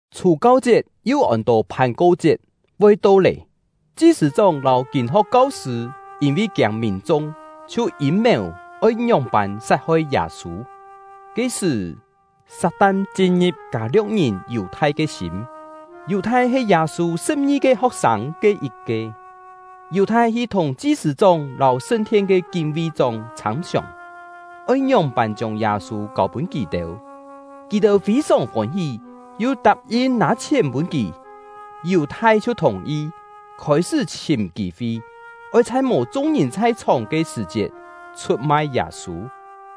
Chhù-kau-chiet (yu ôn-to Phàn-ko-chiet) voi to lé. Chi-sṳ̂-chóng lâu kîn-ho̍k kau-sṳ̂ yîn-vi kiâng mìn-chung, chhiu yîm-mèu oi ngióng-pân sat-hoi Yâ-sû. Ke-sṳ̀, Sat-tan chin-ngi̍p Kâ-lio̍k-ngìn Yù-thai ke sîm. (Yù-thai he Yâ-sû sṳ̍p-ngi-ke ho̍k-sâng ke yit-ke.) Yù-thai hi thùng chi-sṳ̂-chóng lâu sṳn-thien ke kín-ví-chóng chhâm-siòng, oi ngióng-pân chiông Yâ-sû kâu-pûn kì-têu. Kì-têu fî-sòng fôn-hí, yu tap-yin nâ chhièn pûn kì. Yù-thai chhiu thùng-yi, khôi-sṳ́ chhìm kî-fi, oi chhai mò chung-ngìn chhai-chhòng ke sṳ̀-chiet chhut-mai Yâ-sû.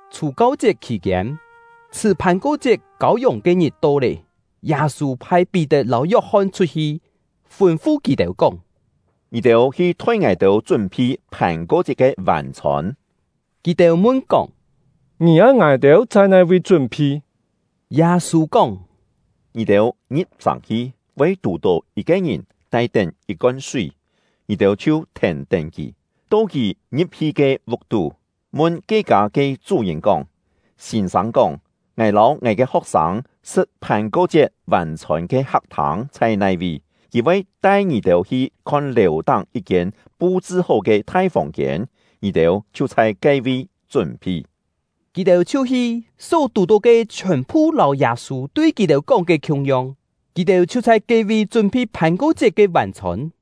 Chhù-kau-chiet khì-kiên, chhṳ̀ Phàn-ko-chiet kâu-yòng ke-ngit to lé. Yâ-sû phai Pí-tet lâu Yok-hon chhut-hi, fûn-fu kì-têu kóng: “Ngì-têu hi thoi ngài-têu chún-phi Phàn-ko-chiet ke vân-chhôn.” Kì-têu mun-kóng: “Ngì oi ngài-têu chhai nai-vi chún-phi?” Yâ-sû kóng: “Ngì-têu ngi̍p-sàng hi, voi tù-tó yit-ke ngìn tai-tén yit-kon súi; ngì-têu chhiu thèn-tén kì, to kì ngi̍p-hi ke vuk-tú, mun ke kâ ke chú-ngìn kóng: ‘Sîn-sâng kóng: Ngài lâu ngài ke ho̍k-sâng sṳ̍t Phàn-ko-chiet vân-chhôn ke hak-thâng chhai nai-vi?’ Kì voi tai ngì-têu hi khon lèu-táng yit-kiên pu-chṳ-hó ke thai fòng-kiên; ngì-têu chhiu chhai ke-vi chún-phi.” Kì-têu chhiu hi; só tù-tó ke chhiòn-phu lâu Yâ-sû tui kì-têu kóng ke khiung-yong; kì-têu chhiu chhai ke-vi chún-phi Phàn-ko-chiet ke vân-chhôn.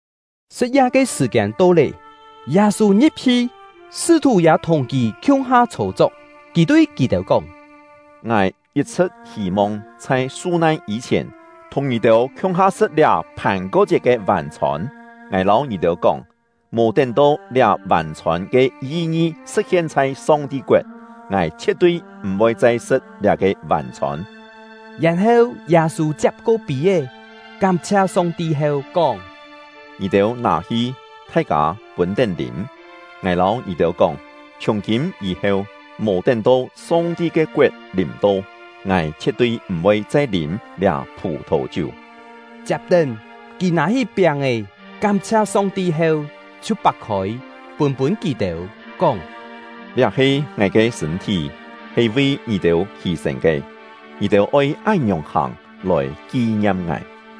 Sṳ̍t-ya ke sṳ̀-kiên to lé, Yâ-sû ngi̍p-hi, sṳ́-thù ya thùng kì khiung-ha chhô-chok. Kì tui kì-têu kóng: “Ngài yit-chhṳ̍t hî-mong chhai su-nan yî-chhièn thùng ngì-têu khiung-ha sṳ̍t liá Phàn-ko-chiet ke vân-chhôn. Ngài lâu ngì-têu kóng, mò tén-to liá vân-chhôn ke yi-ngi sṳ̍t-hien chhai Song-ti koet, ngài chhie̍t-tui m̀-voi chai sṳ̍t liá-ke vân-chhôn.” Yèn-heu, Yâ-sû chiap-ko pî-é, kám-chhia Song-ti heu, kóng: “Ngì-têu nâ-hi, thai-kâ pûn-tén lîm. Ngài lâu ngì-têu kóng, chhiùng-kîm yî-heu, mò tén-to Song-ti ke koet lìm-to, ngài chhie̍t-tui m̀-voi chai lîm liá phù-thò-chiú.” Chiap-tén, kì nâ-hí piáng-è, kám-chhia Song-ti heu, chhiu pak-khôi, pûn-pûn kì-têu, kóng: “Liá he ngài ke sṳ̂n-thí, he vi ngì-têu hî-sên ke; ngì-têu oi án-ngiòng hàng, lòi ki-ngiam ngài.”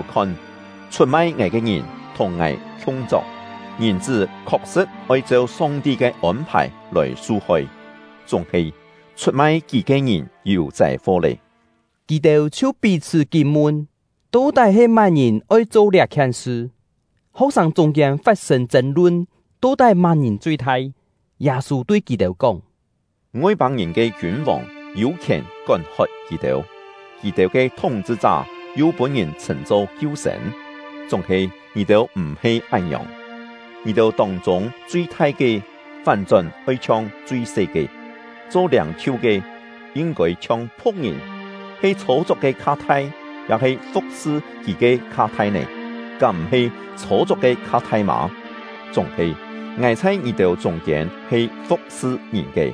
“Ngì-têu khon, chhut-mai ngài ke ngìn thùng ngài khiung-chok! Ngìn-chṳ́ khok-sṳ̍t oi cheu Song-ti ke ôn-phài lòi su-hoi, chúng-he chhut-mai kì ke ngìn yû châi-fo lé!” Kì-têu chhiu pí-chhṳ́ kín-mun, to-tái he má-ngìn oi cho liá-khien sṳ. Ho̍k-sâng chûng-kiên fat-sên chên-lun, to-tái má-ngìn chui-thai. Yâ-sû tui kì-têu kóng: “Ngoi-pâng-ngìn ke kiûn-vòng yû khièn kón-hot kì-têu; kì-têu ke thúng-chhṳ-chá yu pûn-ngìn chhṳ̂n-cho kiu-sên; chúng-he ngì-têu m̀-he án-ngiòng. Ngì-têu tông-chûng chui-thai ke, fán-chón oi chhiong chui-se ke; cho liâng-chhiu ke, yin-kôi chhiong phu̍k-ngìn. He chhô-chok ke kha thai, ya-he fu̍k-sṳ kì ke kha thai nè? Kám m̀-he chhô-chok ke kha thai mâ? Chúng-he, ngài chhai ngì-têu chûng-kiên he fu̍k-sṳ ngìn ke.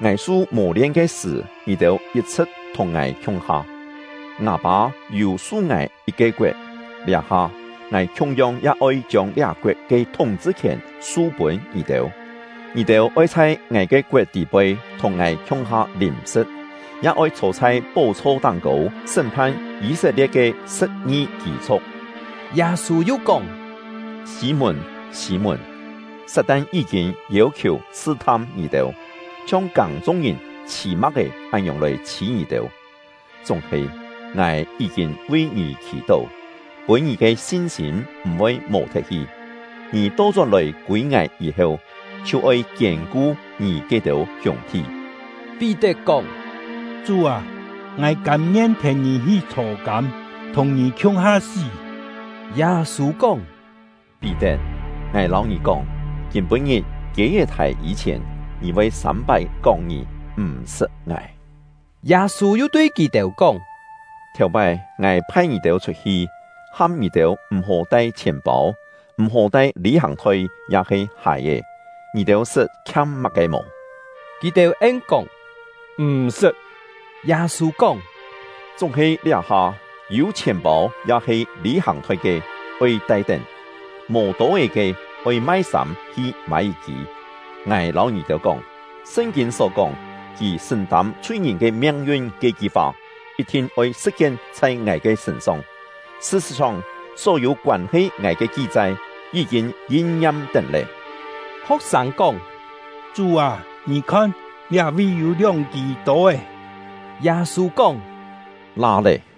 “Ngài su mò-lien ke sṳ̀, ngì-têu yit-chhṳ̍t thùng ngài khiung-ha. Ngâ Pâ yû su ngài yit-ke koet, liá-ha, ngài khiung-yong ya oi chiông liá-koet ke thúng-chhṳ-khièn su-pûn ngì-têu. Ngì-têu oi chhai ngài ke koet tî-poi thùng ngài khiung-ha lîm-sṳ̍t, ya oi chhô chhai pó-chho táng-kô sṳ́m-phan Yî-set-lie̍t ke sṳ̍p-ngi kî-chhu̍k.” Yâ-sû yu kóng: “Sî-mùn, Sî-mùn! Sat-tan yí-kîn yêu-khiù sṳ-tham ngì-têu, chhiong kâng-chung-ngìn chhî ma̍k-é án-ngiòng lòi chhî ngì-têu. Chúng-he, ngài yí-kîn vi ngì khì-tó, pûn ngì ke sin-sîm m̀-voi mò-thet hi. Ngì to-chón-lòi kûi ngài yî-heu, chhiu oi kiên-ku ngì ke-têu hiûng-thi.” Pí-tet kóng: “Chú â, ngài kâm-ngien thèn ngì hi chhô-kâm, thùng ngì khiung-ha sí!” Yâ-sû kóng: “Pí-tet, ngài lâu ngì kóng, kîm-pû-ngit kiê-é thài yî-chhièn, ngì voi sâm-pái kóng ngì m̀-sṳt ngài.” Yâ-sû yu tui kì-têu kóng: “Thèu-pái, ngài phai ngì-têu chhut-hi, ham ngì-têu m̀-hó tai chhièn-pâu, m̀-hó tai lî-hàng-thoi ya-he hài-è, ngì-têu sṳt khiam má-ke mò?” Kì-têu en-kóng: “M̀-sṳt.” Yâ-sû kóng: “Chúng-he liá-ha, yû chhièn-pâu ya-he lî-hàng-thoi ke, oi tai-tén; mò tô-é ke, oi mai sâm hi mâi yit-kî. Ngài lâu ngì-têu kóng, Sṳn-kîn só kóng: ‘Kì sṳ̀n-tâm chhui-ngìn ke miang-yun’ ke-ki fa, yit-thin oi sṳ̍t-hien chhai ngài ke sṳ̂n-song. Sṳ-sṳ̍t-song, só-yû koân-he ngài ke ki-chai yí-kîn yin-ngiam-tén lé.” Ho̍k-sâng kóng: “Chú â, ngì khon, liá-vi yû lióng-kî tô-é.” Yâ-sû kóng: “La lé!”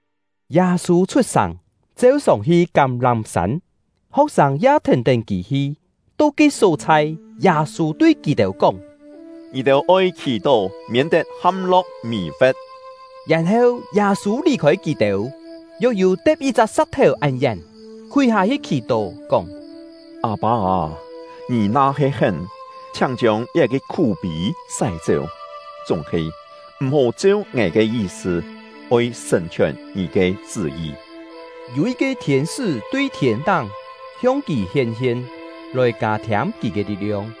Yâ-sû chhut-sàng, cheu-sòng hi Kám-lám-sân; ho̍k-sâng ya thèn-tén kì hi. To ke só-chhai, Yâ-sû tui kì-têu kóng: “Ngì-têu oi khì-tó, miên-tet ham-lo̍k mì-fe̍t.” Yèn-heu, Yâ-sû lì-khôi kì-têu, yok yû te̍p yit-chak sa̍k-thèu án yén, khúi hâ-hi khì-tó, kóng: “Â-pâ â, Ngì na-he hén, chhiáng chiông liá-ke khú-pî sái-chéu; chúng-he, m̀-hó cheu ngài ke yi-sṳ, oi sṳ̀n-chhiòn Ngì ke chṳ́-yi.” Yû yit-ke thiên-sṳ́ tui thiên-táng hiong kì hién-hien, lòi kâ-thiâm kì ke li̍t-liong.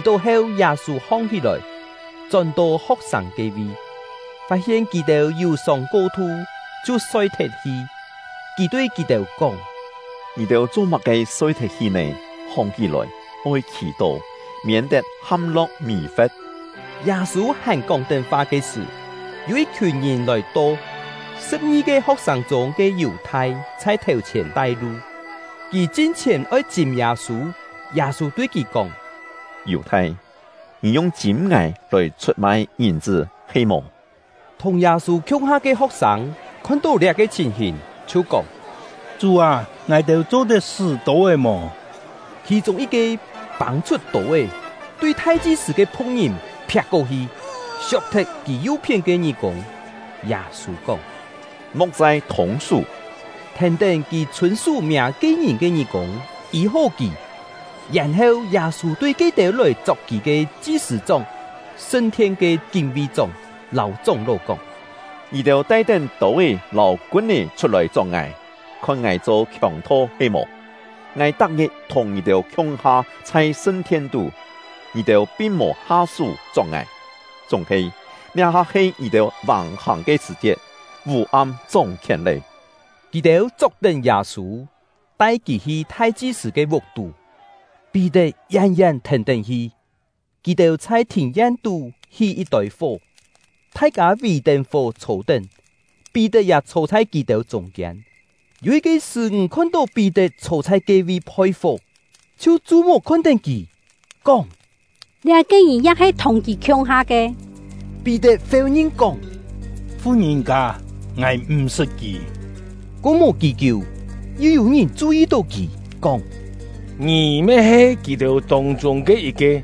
Khì-tó heu, Yâ-sû hong-hí-lòi, chón-to ho̍k-sâng ke-vi, fat-hien kì-têu yù-sông ko-thu chhiu soi-thet-hi. Kì tui kì-têu kóng: “Ngì-têu cho-má-ke soi-thet-hi nè? Hong-hí-lòi, oi khì-tó, miên-tet ham-lo̍k mì-fe̍t.” Yâ-sû hàn kóng-tén fa ke sṳ̀, yû yit-khiùn ngìn lòi-to. Sṳ̍p-ngi-ke ho̍k-sâng chûng ke Yù-thai chhai thèu-chhièn tai-lu, kì chin-chhièn oi chîm Yâ-sû. Yâ-sû tui kì kóng: “Yù-thai, ngì yung chîm ngài lòi chhut-mai Ngìn-chṳ́ he-mò?” Thùng Yâ-sû khiung-ha ke ho̍k-sâng khon-tó liá-ke chhìn-hìn, chhiu kóng: “Chú â, ngài-têu cho-tet sṳ́ tô-é mò?” Khì-chûng yit-ke pâng-chhut tô-é, tui thai-chi-sṳ̂ ke phu̍k-ngìn phiak-ko-hi, siok-thet kì yu-phién ke ngí-kûng. Yâ-sû kóng: “Mo̍k chai thûng-sú!” Thèn-tén, kì chhûn-sú miâ ke-ngìn ke ngí-kûng, yî-hó kì. Yèn-heu, Yâ-sû tui ke-têu lòi chok kì ke chi-sṳ̂-chóng, sṳn-thien ke kín-ví-chóng, lâu chóng-ló kóng: “Ngì-têu tai-tén tô-é lâu kun-é chhut-lòi chok ngài, khon ngài cho khiòng-tho he-mò? Ngài tak-ngit thùng ngì-têu khiung-ha chhai sṳn-thien-tú, ngì-têu pin mò ha-sú chok ngài; chúng-he, liá-ha he ngì-têu vàng-hàng ke sṳ̀-chiet, vû-am chóng-khièn lé.” Kì-têu chok-tén Yâ-sû, tai kì hi thai-chi-sṳ̂ ke vuk-tú; Pí-tet yén-yén thèn-tén hi. Kì-têu chhai thìn-yen-tú hí yit-tôi fó, thai-kâ vì-tén fó chhô-tén, Pí-tet ya chhô chhai kì-têu chûng-kiên. Yû yit-ke sṳ́-ńg khon-tó Pí-tet chhô chhai ke-vi phoi-fó, chhiu chu-muk khon-tén kì, kóng: “Liá-ke ngìn ya he thùng kì khiung-ha ke.” Pí-tet féu-ngin kóng: “Fu-ngìn-kâ, ngài m̀ sṳt kì!” Ko mò kí-kiú, yu yû-ngìn chu-yi-tó kì, kóng: “Ngì me he kì-têu tông-chûng ke yit-ke.”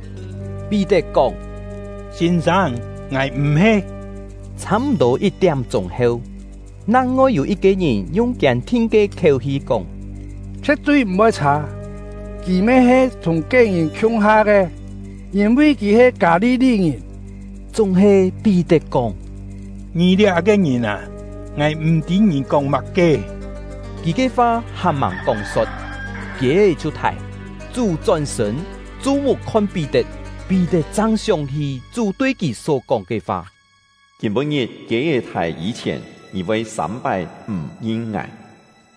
Pí-tet kóng: “Sîn-sâng, ngài m̀-he!” Chhâ-m̀-tô yit-tiám-chûng heu, nang-ngoi yû yit-ke ngìn yung kiên-thin ke khiéu-hi kóng: “Chhie̍t-tui m̀-voi chhâ, kì me he thùng ke-ngìn khiung-ha ke, yîn-vi kì he Kâ-li-li-ngìn!” Chúng-he Pí-tet kóng: “Ngì liá-ke ngìn â, ngài m̀-tî ngì kóng má-ke!” Kì ke fa hàn-màng kóng-so̍t, kiê-é chhiu thài. Chú chón-sṳ̂n, chu-muk khon Pí-tet; Pí-tet chang sióng-hí Chú tui kì só-kóng ke fa: “Kîm-pû-ngit kiê-é thài yî-chhièn, ngì voi sâm-pái m̀ ngin ngài.”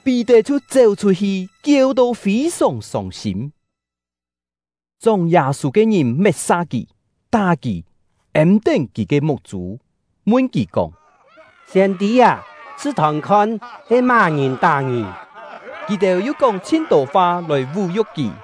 Pí-tet chhiu chéu-chhut-hi, kieu-to fî-sòng sông-sîm. Chóng Yâ-sû ke ngìn met-sa kì, tá kì; êm-tén kì ke muk-chû, mun kì kóng: “Siên-tî â, chhṳ-thòn-khon, he má-ngìn tá ngì?” Kì-têu yu kóng chhin-tô fa lòi vú-yu̍k kì.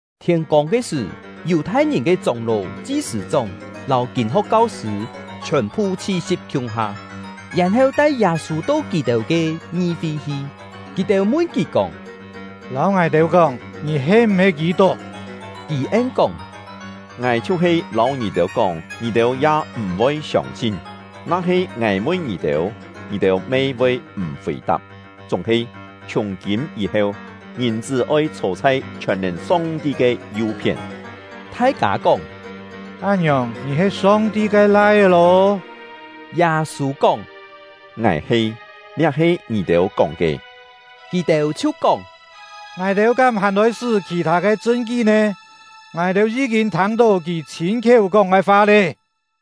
Thiên-kông ke sṳ̀, Yù-thai-ngìn ke chóng-ló, chi-sṳ̂-chóng, lâu kîn-ho̍k kau-sṳ̂ chhiòn-phu chhi-si̍p khiung-ha, yèn-heu tai Yâ-sû to kì-têu ke ngi-fi hi. Kì-têu mun kì kóng: “Lâu ngài-têu kóng, ngì he m̀-he Kî-tuk?” Kì en-kóng: “Ngài chhiu-he lâu ngì-têu kóng, ngì-têu ya m̀-voi siông-sin; na-he ngài mun ngì-têu, ngì-têu me voi m̀ fì-tap. Chúng-he, chhiùng-kîm yî-heu, Ngìn-chṳ́ oi chhô chhai chhiòn-nèn Song-ti ke yu-phién.” Thai-kâ kóng: “Án-ngiòng, ngì he Song-ti ke Lai-é lô?” Yâ-sû kóng: “Ngài he, liá he ngì-têu kóng ke!” Kì-têu chhiu kóng: “Ngài-têu kám hàn oi-sṳ́ khì-thâ ke chṳn-kí nè? Ngài-têu yí-kîn thâng-tó kì chhîn-khiéu kóng ke fa lé!”